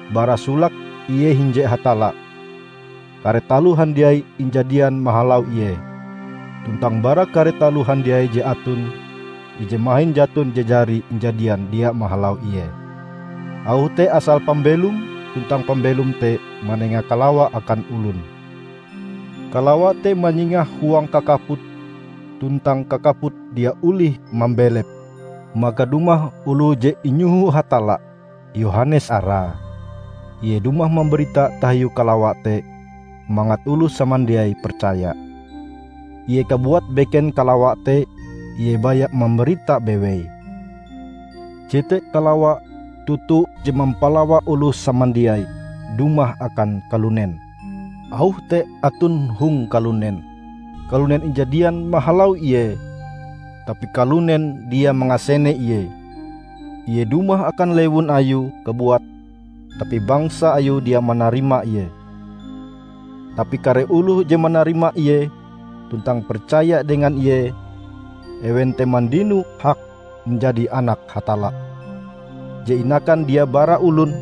Bara solake Ie hinje Hatalla Kare taloh handiai injadian mahalau Ie, tuntang bara kare taloh handiai je aton, ije mahin jaton je jari injadian dia mahalau Ie. Auh te asal pambelom, tuntang pambelom te manenga kalawa akan olon. Kalawa te manyingah huang kakaput, tuntang kakaput dia olih mambelepe. Maka dumah oloh je inyoho Hatalla, Yohanes arae. Ie dumah mambarita tahiu kalawa te, mangat oloh samandiai percaya. Ie kabuat beken kalawa te, ie baya mambarita bewei. Jete kalawa toto je mampalawa oloh samandiai, dumah akan kalunen. Auh te aton hong kalunen, kalunen injadian mahalau Ie, tapi kalunen dia mangasene Ie. Ie dumah akan lewun Ayue kabuat tapi bangsa Ayue dia manarima Ie. Tapi kare oloh je manarima Ie tuntang percaya dengan Ie, ewen te mandino hak manjadi anak Hatalla, je inakan dia bara olon,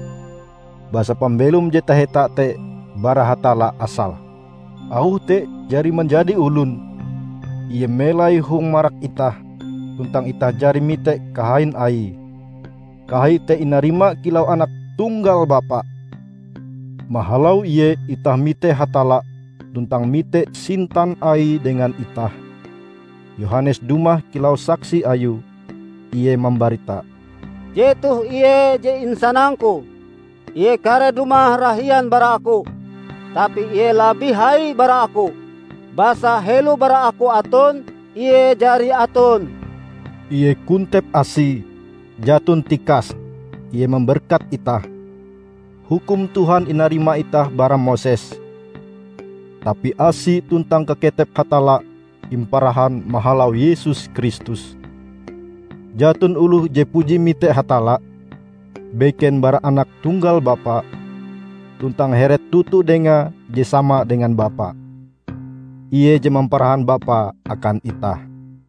basa pambelom je taheta te bara Hatalla asale. Auh te jari manjadi olon, Ie melai hong marak itah, tuntang itah jari mite kahain Aie. Kahai te inarima kilau anak tunggal Bapa. Mahalau Ie itah mite Hatalla tuntang mite sintan Aie dengan itah. Yohanes dumah kilau saksi Ayue, ie mambarita: "Jetoh Ie je insanang-Ku: Ie kareh dumah rahian bara aku, tapi Ie labih hai bara aku, basa helo bara aku aton, Ie jari aton." Ie kontep asi; jaton tikase, Ie mamberkat itah. Hukum Tuhan inarima itah bara Moses. Tapi asi tuntang kaketep Hatalla imparahan mahalau Yesus Kristus. Jaton oloh je puji mite Hatalla, beken bara anak tunggal Bapa, tuntang heret toto Dengae je sama dengan Bapa. Ie je mamparahan Bapa akan itah.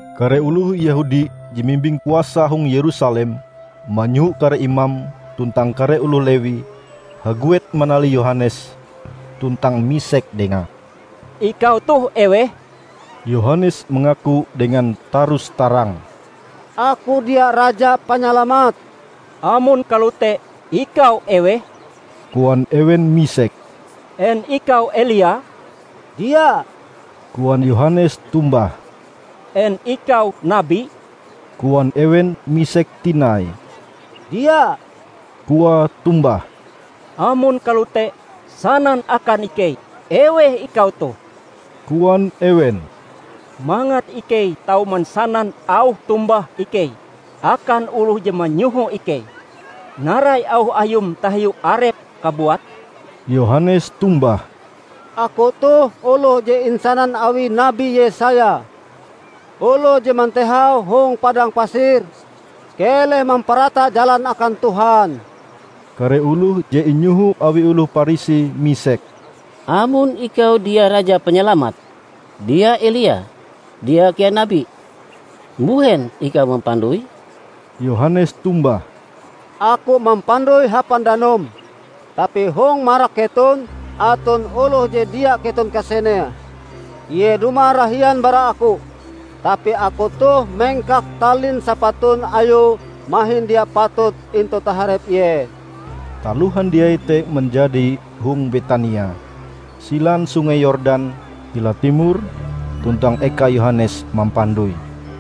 Kare oloh Yehudi je mimbing kuasa hong Yerusalem manyoho kare imam tuntang kare oloh Lewi haguet manalih Yohanes tuntang misek dengae, "Ikau toh eweh?" Yohanes mangaku dengan tarus-tarang, "Aku dia Raja Panyalamat." "Amon kalote, ikau eweh?" koan ewen misek. "En ikau Elia?" "Dia," koan Yohanes tombah. "En ikau Nabi?" koan ewen misek tinai. "Dia," koae tombah. "Amon kalote, sanan akan ikei eweh ikau toh," koan ewen, "mangat ikei tau mansanan auh tombah ikei akan oloh je manyoho ikei. Narai auh ayum tahiu arepm kabuat?" Yohanes tombah, "Aku toh oloh je insanan awi Nabi Yesaya: 'Oloh je mantehau hong padang pasir: Keleh mamparata jalan akan Tuhan.' " Kare oloh je inyoho awi oloh Parisi misek, "Amon ikau dia Raja Panyalamat, dia Elia, dia kea Nabi, mbuhen ikau mampandoi?" Yohanes tombah, "Aku mampandoi hapan danum. Tapi hong marak keton aton oloh je dia keton kasenee. Ie dumah rahian bara aku, tapi aku toh mengkak talin sapatun Ayue mahin dia patut intu taharep Ie." Taloh handiai te manjadi hong Betania, silan Sungei Yordan hila timor tuntang eka Yohanes mampandoi.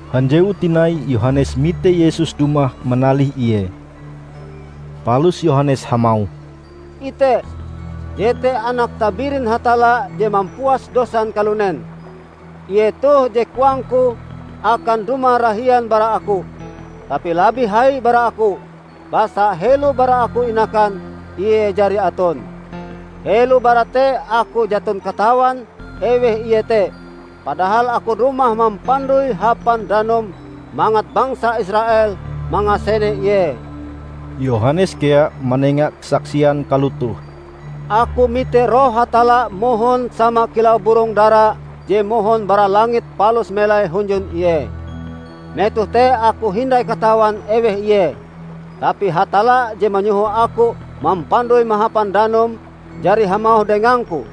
Hanjewu tinai Yohanes mite Yesus dumah manalih ie. Palus Yohanes hamauh, "Ite, jete Anak tabirin Hatalla je mampuas dosan kalunen. Ie toh je koangku akan dumah rahian bara aku, tapi labih hai bara aku, basa helo bara aku inakan, Ie jari aton. Helo bara te aku jaton katawan eweh Ie te. Padahal aku dumah mampandoi hapan danum mangat bangsa Israel mangasene Ie." Yohanes kea manenga kasaksian kalotoh, "Aku mite Roh Hatalla mohon sama kilau burong dara je mohon bara langit palus melai hunjun Ie. Metoh te aku hindai katawan eweh Ie. Tapi Hatalla je manyoho aku mampandoi mahapan danum jari hamauh dengangku,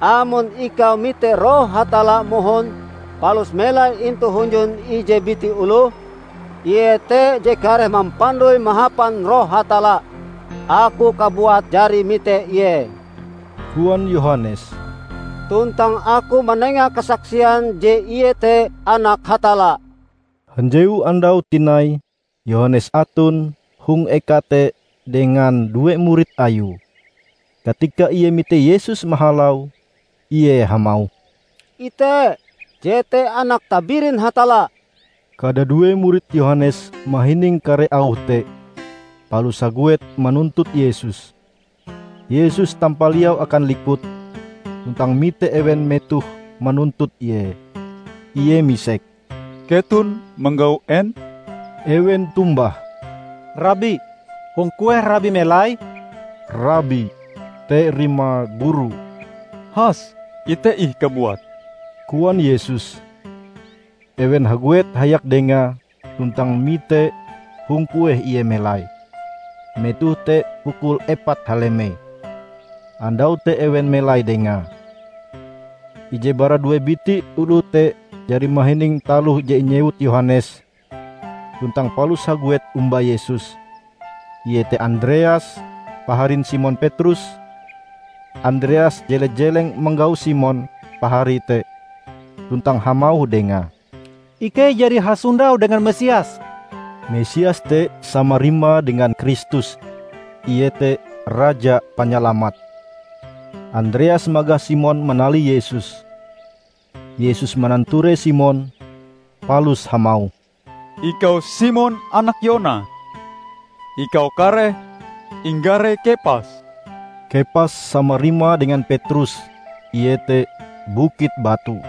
'Amon ikau mite Roh Hatalla mohon, palus melai intu hunjun ije biti oloh, Ie te je kareh mampandoi mahapan Roh Hatalla.' Aku kabuat jari mite Ie," koan Yohanes, "tuntang aku manenga kasaksian je Ie te Anak Hatalla." Hanjewu andau tinai Yohanes aton hong eka te dengan due murid Ayue. Katika ie mite Yesus mahalau, ie hamauh, "Ite! Jete Anak Tabirin Hatalla." Kadadue murid Yohanes mahining kare auh te, palus haguet manuntut Yesus. Yesus tampaliau akan likut, tuntang mite ewen metohe manuntut Ie. Ie misek. "Keton manggau en?" Ewen tombah, "Rabi, hong kueh Rabi melai?" ('Rabi' te rimae guru.) "Has ite ih kabuat," koan Yesus. Ewen haguet hayak Dengae tuntang mite hong kueh Ie melai. Metoh te pukul epat halemei. Andau te ewen melai Dengae. Ije bara due biti oloh te jari mahining taloh je inyewut Yohanes tuntang palus haguet omba Yesus, iete Andreas, paharin Simon Petrus. Andreas jele-jeleng manggau Simon, paharie te, tuntang hamauh dengae, "Ikei jari hasondau dengan Mesias!" (Mesias te sama rimae dengan Kristus iete: Raja Panyalamat.) Andreas magah Simon manalih Yesus. Yesus mananture Simon, palus hamauh, "Ikau Simon, anak Yona. Ikau kareh inggare Kepas." (Kepas sama rimae dengan Petrus, iete: bukit batu.)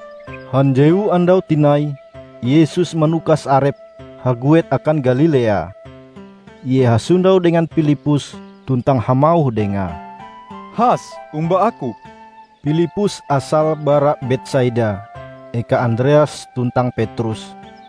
Hanjewu andau tinai Yesus manukas arepe haguet akan Galilea. Ie hasondau dengan Pilippus, tuntang hamauh dengae, "Has omba Aku!" Pilippus asale bara Betsaida, eka Andreas tuntang Petrus.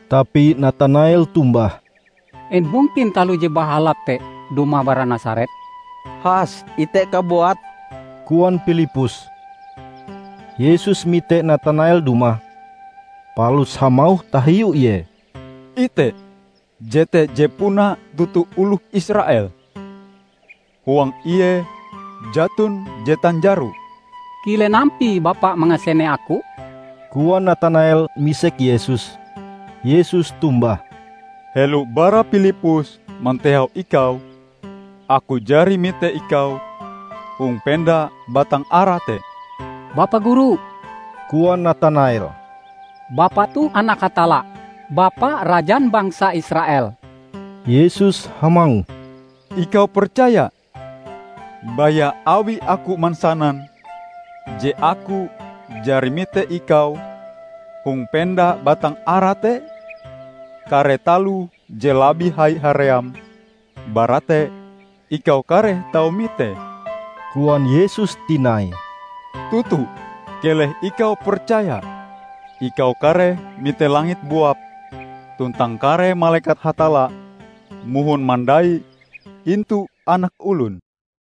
Tapi Natanael tombah, "En mungkin taloh je bahalap te dumah bara Nasaret?" "Has ite kabuat," koan Pilippus. Yesus mite Natanael dumah, palus hamauh tahiu Ie, "Ite, jete je puna toto oloh Israel. Huang ie jaton je tanjaro." "Kilen ampie Bapa mangasene aku?" koan Natanael misek Yesus. Yesus tombah, "Helo bara Pilippus mantehau ikau, Aku jari mite ikau hong penda batang ara te." "Bapa Guru," koan Natanael, "Bapa toh anak Hatalla! Bapa Rajan bangsa Israel!" Yesus hamauh, "Ikau percaya, baya awi Aku mansanan je Aku jari mite ikau hong penda batang ara te? Kare taloh je labih hai haream bara te ikau kareh tau mitee!" Koan Yesus tinai, "Toto, keleh ikau percaya, ikau kareh mite langit buap, tuntang kare malekat Hatalla mohon mandai intu Anak Olon."